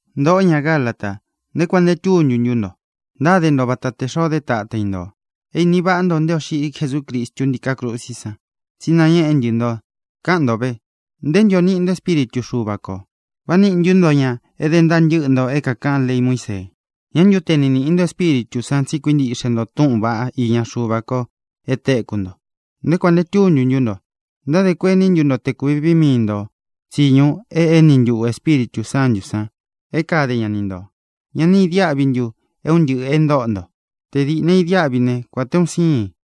Ntōꞌó, ña Galata, ¿nté kuān nte túntu ntú nto? Ntáde nto vata o tē xoo dé tata i ntō. É īni váꞌa nto nté ō xiꞌi Jesúcristu ntíká krusí san, tsi é nañēꞌé ntɨ nto. Kaꞌán nto vē, ¿nté ntu ō niꞌi nto Espíritu Xuva kō? ¿Vá nīꞌi ntu nto ña é dé ntaa ntɨ́ꞌɨ nto é kākaꞌán lei Muísee? ¿Ñā ntu te ni níꞌi nto Espíritū san tsi é kuíntiꞌxe nto túꞌūn vaꞌá iña Xuva ko e téku nto? ¿Nté kuān nte túntu ntú nto? ¿Ntádē kuení ntu nto te kūvi vii mii nto tsiñu e éni ntuꞌū Espíritū Sántū san é kade ña ni ntō? ¿Ñá ni īdiáꞌvi ntu é un ntɨꞌɨ̄ e ntóꞌo nto? ¡Tē dɨ́ ni idiáꞌvi ne, kuān te un siin!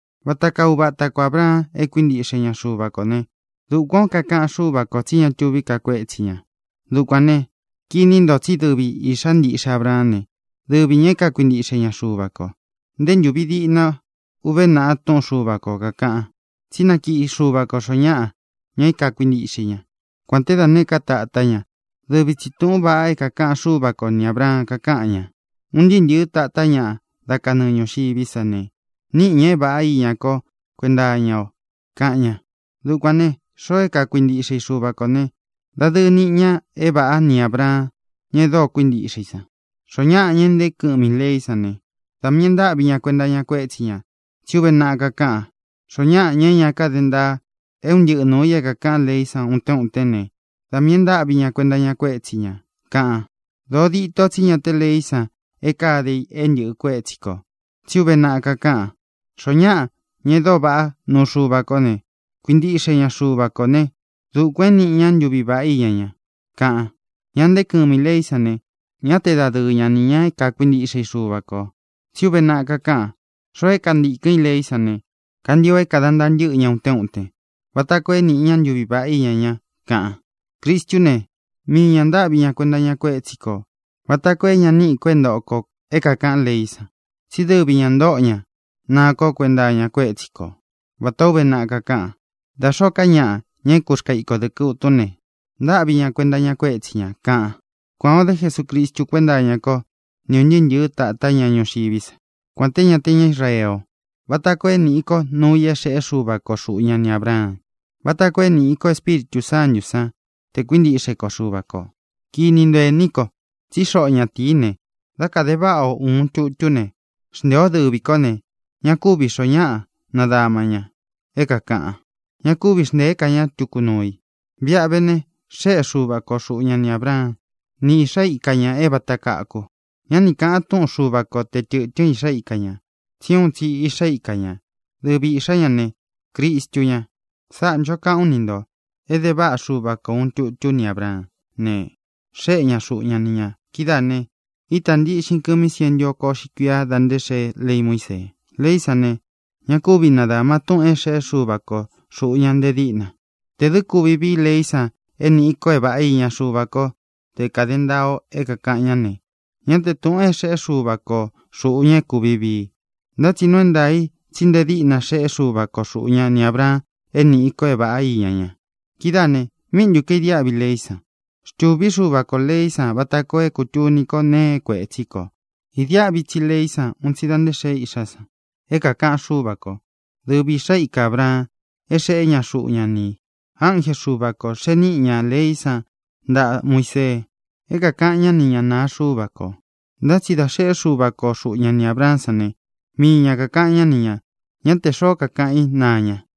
Vata kaa uva ata ko Ābraan e kuíntiꞌxe ña Xuva kō ne, dukuān ó kakaꞌan Xúva kō tsí ña tuví ka kuétsi ñā. Dukuān ne, kini nto tsí dɨvi īꞌxá ntiꞌxe Abraán ne, dɨvi ñā é kakuintiꞌxe ña Xuva kō. Nté ntūvi diꞌna uve naꞌa túꞌun Xuva kō kakaꞌan tsí nakiꞌi Xuva kō xoó ñaꞌa, ña é kuintiꞌxe i ña, kuān te dá nēé ka tatá ña. Dɨvi tsī túꞌūn vaꞌa é kākaꞌan Xúva ko ni Ābraan, kakáꞌan ña: “Un ntɨɨ́ ntɨ̄ɨ́ tatá ñaꞌa dá kanɨɨ ñūxiví sa ne, níꞌi ñā é vāꞌá iña ko kuénta iña o”, kaꞌan ña. Dukuān ne, xoo é kakuintiꞌxe i Xuva kō ne, dadɨɨ niꞌi ña é vāꞌá ni Ābraan, ña e dóo kuíntiꞌxe i san. Xoó ñaꞌa, ña é ntēé kɨmi ī leí san ne, da miī e ntáꞌvi ña kuenta iña kuétsi ñā. Tsí uve naꞌa kakáꞌan: “Xoó ñaꞌa, ña é ña káde ntaa é un ntɨꞌɨ nuū i é kākaꞌán leí san utén utén ne, da miī e ntáꞌvi ña kuenta iña kuétsi ñā”, kaꞌan. Dōó dito tsí ña té leí san é kāde i é ntɨ̄ꞌɨ kuétsi kō. Tsí uve naꞌa kakáꞌan: “Xoó ñaꞌa, ña e dóo vaꞌá nuu Xuva kó ne, kuintiꞌxe ña Xuva kō né, dukuān é nīꞌi ña ntuví vaꞌá iña ña”, kaꞌan. Ña e ntée kɨmi i leí san ne, ñá te dadɨɨ ña nī ña é kakuintiꞌxe i Xuva kō. Tsí uve naꞌa kakáꞌan: “Xoo é kantīkɨn í leí san ne, kantio é kāda ntaa ntɨ́ꞌɨ ña utén utén vata koo é nīꞌi ña ntuví vaꞌá iña ña”, kaꞌan. Cristú ne, mii ñā ntáꞌvi ña kuenta iña kuétsi kō vata koo é ña níꞌi kō é ntoꞌo kō é kākaꞌán leí san. Tsí dɨvi ñā ntóꞌo ña naa ko kuenta iña kuétsi ko vatā ó uve naꞌa kakáꞌan: “Da xōó ka ñaꞌa, ña é kurkāa iko dɨkɨ utún ne, ntáꞌvi ña kuenta iña kuétsi ñā”, kaꞌan. Kuān o dé Jesucristu kuénta iña ko ni ūn ntɨɨ́ ntɨ̄ɨ́ tatá ñaꞌa ñuxiví sa, kuān té ña te ña Israee o, vata koo é nīꞌi ko núu i é xeꞌé Xuva ko xuꞌu ña ni Ābraan, vata koo é nīꞌi ko Espíritū Sántū sán tē kuíntiꞌxe ko Xuva kō. Kini nto, ení ko, tsí xoꞌo ñatīí ne, dá kāde váꞌa o ūun tutú ne, xnteē o dɨ́vi kó ne, ña kúvī xoó ñaꞌa nadama ña é kākaꞌan. Ña kúvi xntēé ka ña tuku nuu i. Viꞌa ve ne, xéꞌe Xuva ko xuꞌu ña ni Ābraan, ni iꞌxá ika ñā é vāta kaku. Ñá ni kāꞌan túꞌun Xuva ko te tɨ̄tɨ́n iꞌxá ika ñā, tsi úun tsi iꞌxá ika ñā. Dɨvi iꞌxā ñá ne, Cristu ña. Sáꞌā ncho kaꞌán u ni ntō: Ede váꞌa Xuva ko ūun tutú ni Ābraán ne, xéꞌe ña xuꞌu ña ni ñā. Kidáā ne, ítā ntiꞌxin kɨmi sientu oko uꞌxi kuiá dā nté xeé lei Muísee. Leí san ne, ña kúvi nadāma túꞌūn é xēꞌé Xuva ko xūꞌu ña nte díꞌna. Tē dɨ́ kuvi vií leí san é nīꞌi ko é vāꞌá iña Xuva ko te kade ntáa ō é kākaꞌán ne, ñá te tūꞌun é xeꞌé Xuva ko xūꞌu ña é kūvi vii i. Ntá tsi nuu é ntaā i tsí nte díꞌna xeꞌé Xuva ko xuꞌu ña ni Ābraan é nīꞌi ko é vāꞌá iña ña. Kidáā ne, ¿míꞌi ntu kaīdiáꞌvi leí san? Xtūví Xuva kō leí san vata koo é kūtuni ko nee é kuētsí kō. Īdiáꞌvi tsi leí san un tsi da nté xēe “iꞌxá san” é kākaꞌan Xúva kō, dɨvi īꞌxá ika Ābraan é xeꞌé ña xuꞌu ña ni ī. Ánje Xuva kō xee niꞌi ña leí san ntaꞌa Muisee é kākaꞌan ñá ni ñāꞌa naa Xuva ko. Ntá tsi dā xeꞌé Xuva ko xuꞌu ña ni Ābraán san ne, mii ña kākaꞌan ñá ni ñā. Ñá tē xoó kakaꞌan í naa ña.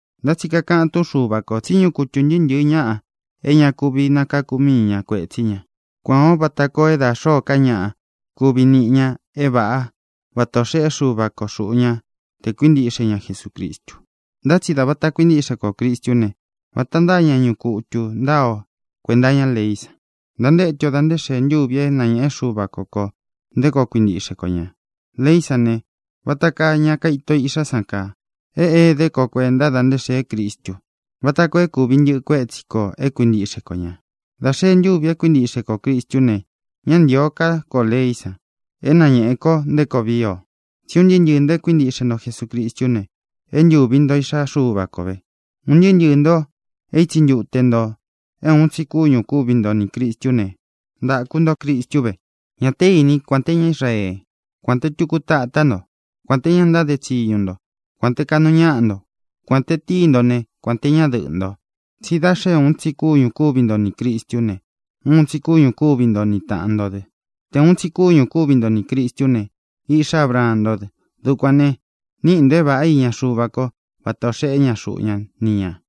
Ntá tsi kakaꞌan túꞌun Xuva kō tsí ñuꞌu kutū ntɨɨ́ ntɨ̄ɨ́ ñaꞌa é ña kuvi nakáku mii ña kuētsí ña. Kuān ó vata koo é da xōó ka ñaꞌa kuvi niꞌi ña é vāꞌá vata ō xeꞌé Xuva ko xuꞌu ña tē kuíntiꞌxe ña Jesucristu. Ntá tsi dā vata kuintíꞌxe kō Cristú ne, vata ntáa ña ñuꞌu kutū ntáa ō kuenta iñá leí san. Ntantétu o dā nté xēe ntúvi é nañēꞌe Xúva ko kō nté koo kuintiꞌxe ko ñā. Leí san ne, vata kaa ña kaito iꞌxá san kaa. É ēdé ko kuēnta da nté xēé Cristu vata koo é kūvi ntɨꞌɨ kuétsi kō é kuintiꞌxe ko ñā. Dā xee ntúvi é kuintiꞌxe kō Cristú ne, ñá ntīo ká kō leí san é nañēꞌe ko nté koo vii o. Tsí un ntɨɨ́ ntɨɨ̄ nto e kuíntiꞌxe nto Jesucristú ne, é ntūvi nto iꞌxá Xuva ko vē. Un ntɨɨ́ ntɨɨ̄ nto é itsi ntute nto é uun tsi kúñū kúvi nto nī Cristú ne, ntāku nto Cristu ve. Ña té īní kuān te ñá Israee, kuān te tuku tatá nto; kuān te ña ntáde tsiñu nto, kuān te kaꞌnu ñáꞌa nto; kuān te tíi nto ne, kuān te ñadɨꞌɨ́ nto. Tsí da xé uun tsi kúñū kúvi nto nī Cristú ne, uun tsi kúñū kúvi nto ni tāꞌan nto dɨ. Tē uun tsi kúñū kúvi nto nī Cristú ne, iꞌxá Abraan ntó dɨ. Dukuān ne, níꞌi ntō é vāꞌá iña Xuva ko vata ō xeꞌé ña xuꞌu ña ni ñā.